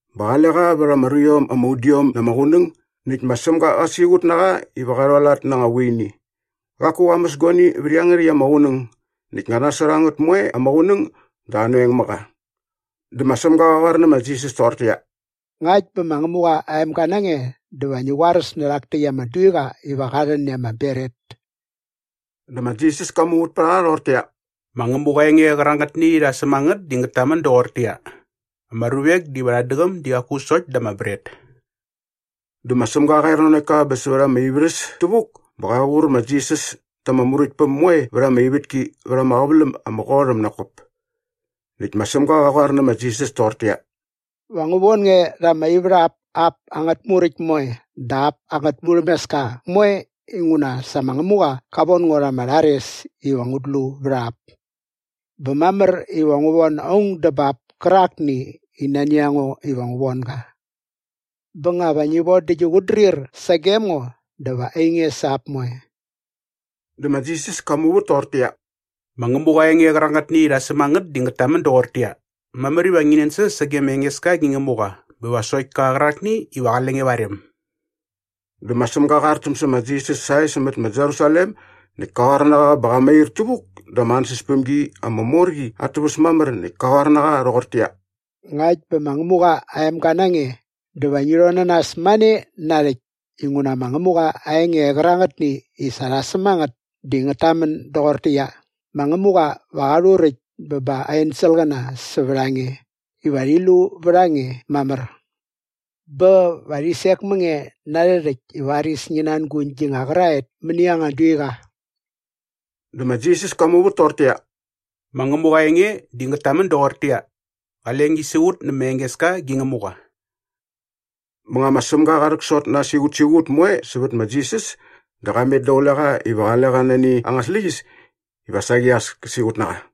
bä qale qa vät ama ruiom ama udiom na ama qunäng näkt ma Sämga qa siqut na qa iva qa rhualat na anga vuini. Qaku qa mäs guani vät iangärhäkt ama qunäng näkt nga nasot a ngät moe ama qunäng dä anoeng mä qa. Dä ma Sämga qa qoar nä ma Jisas toqortäqyia, “Ngakt bä ma Ngämuqa aa emga na nge dä va ngi qoaräs nä rhak täkt ama duiqa iva qä rhän i ama bret.” Dä ma Jisas ka muvät pät a qa rhoqortäqyia, “Ma Ngämuqa aa enge qärangätni i sa rha säm a ngät di ngät tamän doqortäqyia, ‘Ama ruvek diva rhat däqäm di qaku sokt da ama bret.’” Dä ma Sämga qa er nanokt ka bä sävät ama ivärhäs tävuk bä qa qur ma Jisas ta ama muräktpäm moe vät ama ivätki vät ama qäväläm ama qot äm nak kop. Näkt ma Sämga qa qoar nä ma Jisas toqortäqyia, “Va ngu von nge rha ama ivärhap ap angät muräkt moe dä ap angät murhämeska moe inguna sa ma Ngämuqa qa von ngo rha ama rhares iva ngut lu vät a ap. Bä mamär iva ngu von aung dä bap kärakni i nani a ngo iva ngu von ga. Bä nga va ngi von dä gi qutdrir sagem ngo dä va ainge sa ap moe.” Dä ma Jisas ka muvät toqortäqyia, “Ma Ngämuqa aa enge qärangätni i sa rha säm a ngät di ngät tamän doqortäqyia, ‘Mamär iva ngi nänsäs sage ma Engeska gi Ngämuqa bä va sokt ka qärakni iva qale nge va aa rem.’” Dä ma Sämga qa artäm sä ma Jisas sae sämät ma Jerusalem näkt ka qoar na qa bä qa mair tävuk da ama ansäspämgi ama mor qi at täväs mamär näkt kä qoar na qa rhoqortäqyia, “Ngakt bä ma Ngämuqa aa emga na nge dä va ngi rhon na nas mane narhäkt. Inguna ma Ngämuqa aa enge qärangätni i sa rha säm a ngät di ngät tamän doqortäqyia, “‘Ma Ngämuqa va qa rhuräkt bä ba aa enselqäna sävät a nge iva rhi lu vät a nge mamär.’ bä “‘Va rhi sek mä nge na arhä rhäkt i varis ngi nanguñ gi nga qäraet mäni anga duiqa.’” Dä ma Jisas ka muvät toqortäqyia, “Ma Ngämuqa aa enge di ngät tamän doqortäqyia, ‘Qale ngi siqut nä ma Engeska gi Ngämuqa.’” Bä nga ma Sämga qa rhäksot na aa siqutsiqut moe sävät ma Jisas dä qa met daqule qa iva qale qa nani anga släqyäs iva saqi as kä siqut na qa.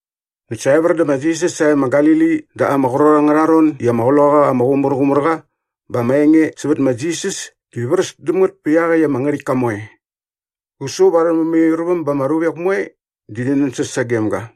Näkt sa evär dä ma Jisas sae ma Galili da ama qrot angärha ron i ama Qloqaqa ama Qumärqumärqa bä ama enge sävät ma Jisas di vräs däm ngät pät iaqäkt ama ngärhäktka moe. Qä su va arhä mämairväm bä ama ruvek moe di rhi nänsäs sagem ga.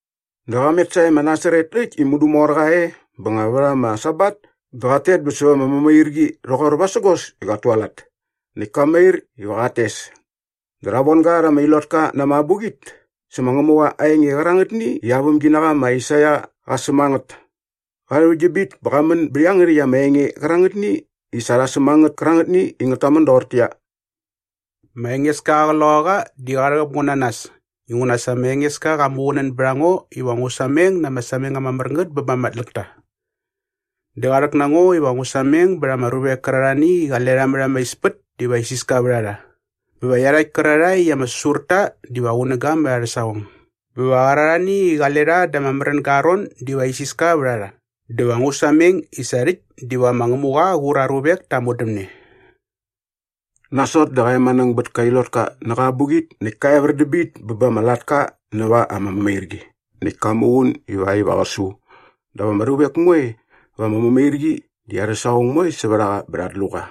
Dä qa met sae ma Nasaret äkt i mudu mor qa e bä nga vät ama Sabat dä qat tet bä säva ama mämairqi rhoqor vasägos i qat tualat. Näkt ka mair iva qat tes. Dä rha von ga rha ama ilotka na ama abuqit sä ma Ngämuqa aa enge qärangätni i aa vämginaqa ma Aisaia qa säm a ngät. Qa rhäväkt dä bit bä qa män bät iangärhäkt ama enge qärangätni i sa rha säm a ngät kärangätni i ngät tamän doqortäqyia, “Ma Engeska aa Qloqaqa di qa rhäqäp ngo na nas inguna sa ma Engeska qa muqunän bät a ngo iva ngu sameng na ama sameng ama mär ngät bä ba ama tläkta. Dä qa rhäk na ngo iva ngu sameng bät ama ruvek kärarhani i qale rha mät ama ispät diva isiska vät a rha bä va iarhakt kärarhae i ama säsur ta diva qunäga mät arhä saqong bä va qärarhani i qale rha da ama märänga aa ron diva isiska vät a rha dä va ngu sameng i sa rhäkt diva ma Ngämuqa qä qur aa ruvek ta aa modämne.” Nasot dä qa emanäng bät ama ilotka nä qa abuqit näkt ka evär dä bit bä ba ama latka näva ama mämairqi näkt ka muqun ivakt iva qä su. Dap ama ruvek moe va ama mämairqi di arhä saqong moe sävät a qa bä rhat lu qa.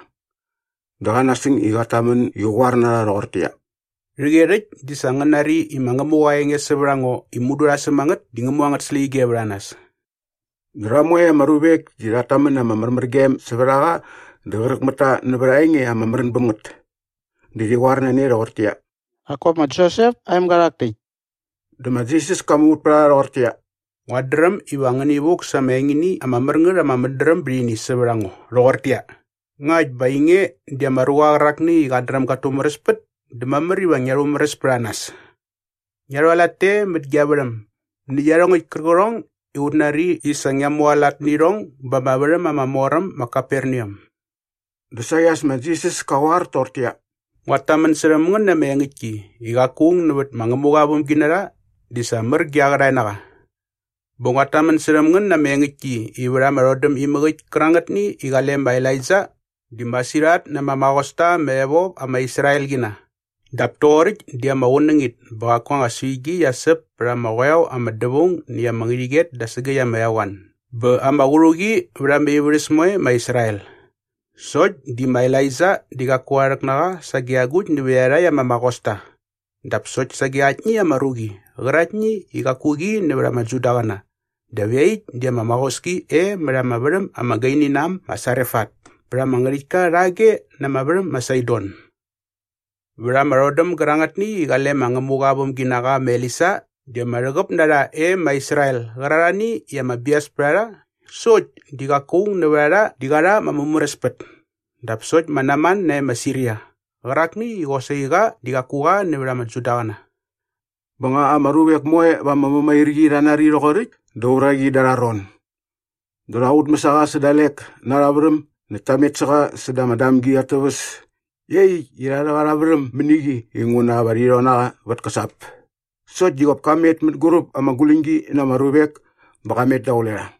Dä qa nasäng i qat tamän i qä qoar na rha rhoqortäqyia, “Rhäqyerhäkt di sa ngän nari i ma Ngämuqa aa enge sävät a ngo i mudu rha säm a ngät di ngä mu angät släqyige vät a nas.” Rha moe ama ruvek di rhat tamän na ama märmärgem sävät a qa dä qräk mät ta nävät aa enge ama märän bäm ngät. Dä rhi qoar na ne rhoqortäqyia, “Nak kop ma Josep aa emga rhak täkt.” Dä ma Jisas ka muvät pät a rha rhoqortäqyia, “Nguat dräm iva ngäni vuk sa ama engini ama mär ngät ama mädräm bät ini sävät a ngo rhoqortäqyia, ‘Ngakt bä nga ainge di ama ruqa qärakni i qat dräm gat tumäräspät dä mamär iva ngia rhumäräs pät a nas! Ngia rhualat te mät gia värhäm nä iarhongäkt kärqärhong i ut nari i sa ngia mualat nä irhong ba ama värhäm ama mor äm ma Kaperneam.’” Dä saqi as ma Jisas kä qoar toqortäqyia, “Nguat tamän särhäm ngän na ama engäktki i qaku aung nävät ma Ngämuqa aa vämginarha di sa mär ge aa qärhae na qa. Bä nguat tamän särhäm ngän na ama engäktki i vät ama rhodäm imäk äkt kärangätni i qale ma Elaija di masirhat na ama maqosta ama evop ama Israelqina dap toqoräkt di ama qunängit bä qaku anga suigi qia säp pät ama qoeo ama dävaung näkt ama ngärhäqyet da sägäkt ama eqoan bä ama qärhuqi vät ama ivärhäs moe e ma Israel. Sokt di ma Elaija di qaku rha rhäk na qa sage agukt nävät iarhakt ama maqosta dap sokt sage aktni ama ruqi qäraktni i qaku qi nävät ama Judaqäna dap iaqyäkt di ama maqoski e mät ama värhäm ama gaini na äm ma Sarefat pät ama ngärhäktka rhage na ama värhäm ma Saidon. Vät ama rhodäm gärangätni i qale ma Ngämuqa aa vämginaqa ma Elisa di ama rhäqäp na rha e ma Israel qärarhani i ama bias pät a rha sokt di qaku aung nävät a rha di qa rha ama mumäräspät dap sokt ma Naman nae ma Siria qärakni i qosaqi qa di qaku qa nävät ama Judaqäna.” Bä nga ama ruvek moe va ama mämairqi rha nari rhoqoräkt dä uraqi da arha ron. Dä rha qutmäs a qa sä dalek na arha värhäm näkt ta met sä qa säda ama damgi at täväs iaqyäkt i rha rhäk arha värhäm mäni qi iva nguna rhi rhon na qa vät käsap. Sokt di qop ka met mänguräp ama guläñgi na ama ruvek bä qa met daqule rha.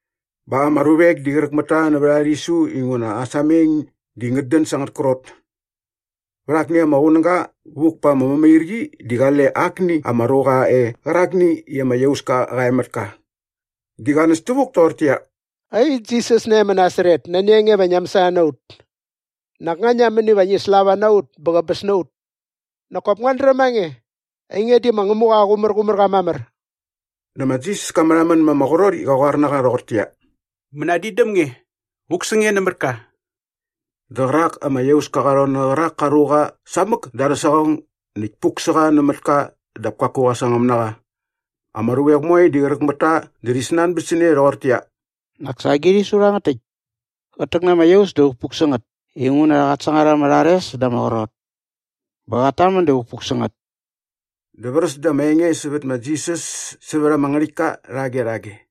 Bä ama ruvek di qräk mät ta nävät aa rhisu inguna aa sameng di ngät dän sa angät krot. Vät akni ama qunäga vuk pa ama mämairqi di qale akni ama ruqa qa e qärakni i ama iauska qa e mät ka. Di qa näs tävuk toqortäqyia, “Ai, Jisas nae ma Nasaret, nani a nge iva ngia mäsana na ut? Nak nga ngia män iva ngi slava na ut bä qäbäs na ut? Nak kop nguat dräm a nge. Ainge di ma Ngämuqa aa Qumärqumärqa mamär.” Dä ma Jisas ka märhamän ma ama qrot i qä qoar na qa rhoqortäqyia, “Mänadin däm nge! Vuk sä nge nämät ka!” Dä qärak ama iauska qa rhon nä qärak ka ruqa samäk da arhä saqong näkt puk sä qa nämät ka dap kaku qa sangäm na qa. Ama ruvek moe di qräk mät ta dä rhi snanbät sä ne rhoqortäqyia, “Nak sa agi rhisu rhangät täkt? Qät täk na ama iaus dä vukpuk sä ngät inguna qat sangar ama rhares dä ama qrot. Bä qat tamän dä vukpuk sä ngät!” Dä vräs da ama enge sävät ma Jisas sävät ama ngärhäktka rhage rhage.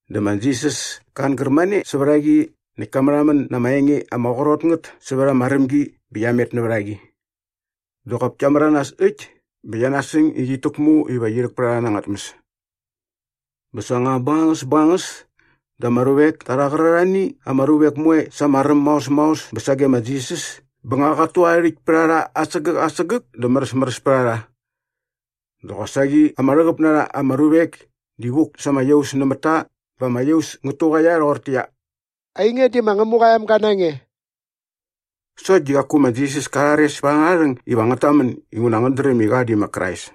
Dä ma Jisas ka angär mane sävät a qi näkt ka märhamän na ama enge ama qrot ngät sävät ama rämgi bä qia met nävät a qi. Dä qop kia märanas äkt bä qia nasäng i qit täkmu iva qi rhäk pät a rha na anga tmäs. Bä sa nga bängangäs bängangäs dä ma ruvek ta rha qärarhani ama ruvek moe sa ama räm maos maos bä sage ma Jisas bä nga qat tu aa rhäkt pät a rha asägäk asägäk dä märäsmäräs pät a rha. Dä qosaqi ama rhäqäp na rha ama ruvek di vuk sa ama iaus nämät ta bä ama iaus ngät tuqaia rhoqortäqyia, “Ainge di ma Ngämuqa aa emga na nge.” Sokt di qaku ma Jisas ka rhares pät angärha rhäng iva ngät tamän inguna ngät dräm i qa di ma Krais.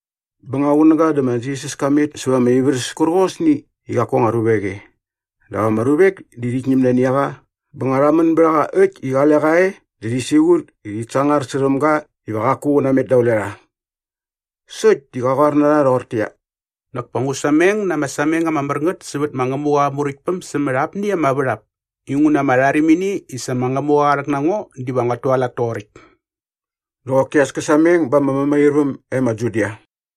Bä nga qunäga dä ma Jisas ka met sävät ama ivärhäs kärqosni i qaku anga ruvek e. Dap ama ruvek di rhit ñäm nani a qa bä nga rha män bät a qa äkt i qale qa e dä rhi siqut i rhit sangar särhäm ga iva qaku qä namet daqule rha. Sokt di qä qoar toqortäqyia, “Nak pa ngu sameng na ama sameng ama mär ngät sävät ma Ngämuqa aa Muräktpäm sämät apni ama värhap inguna ama rharimini i sa ma Ngämuqa qa rhäk na ngo diva nguat tualat toqoräkt.” Dä qoki as kä sameng ba ama mämairväm e ma Judia.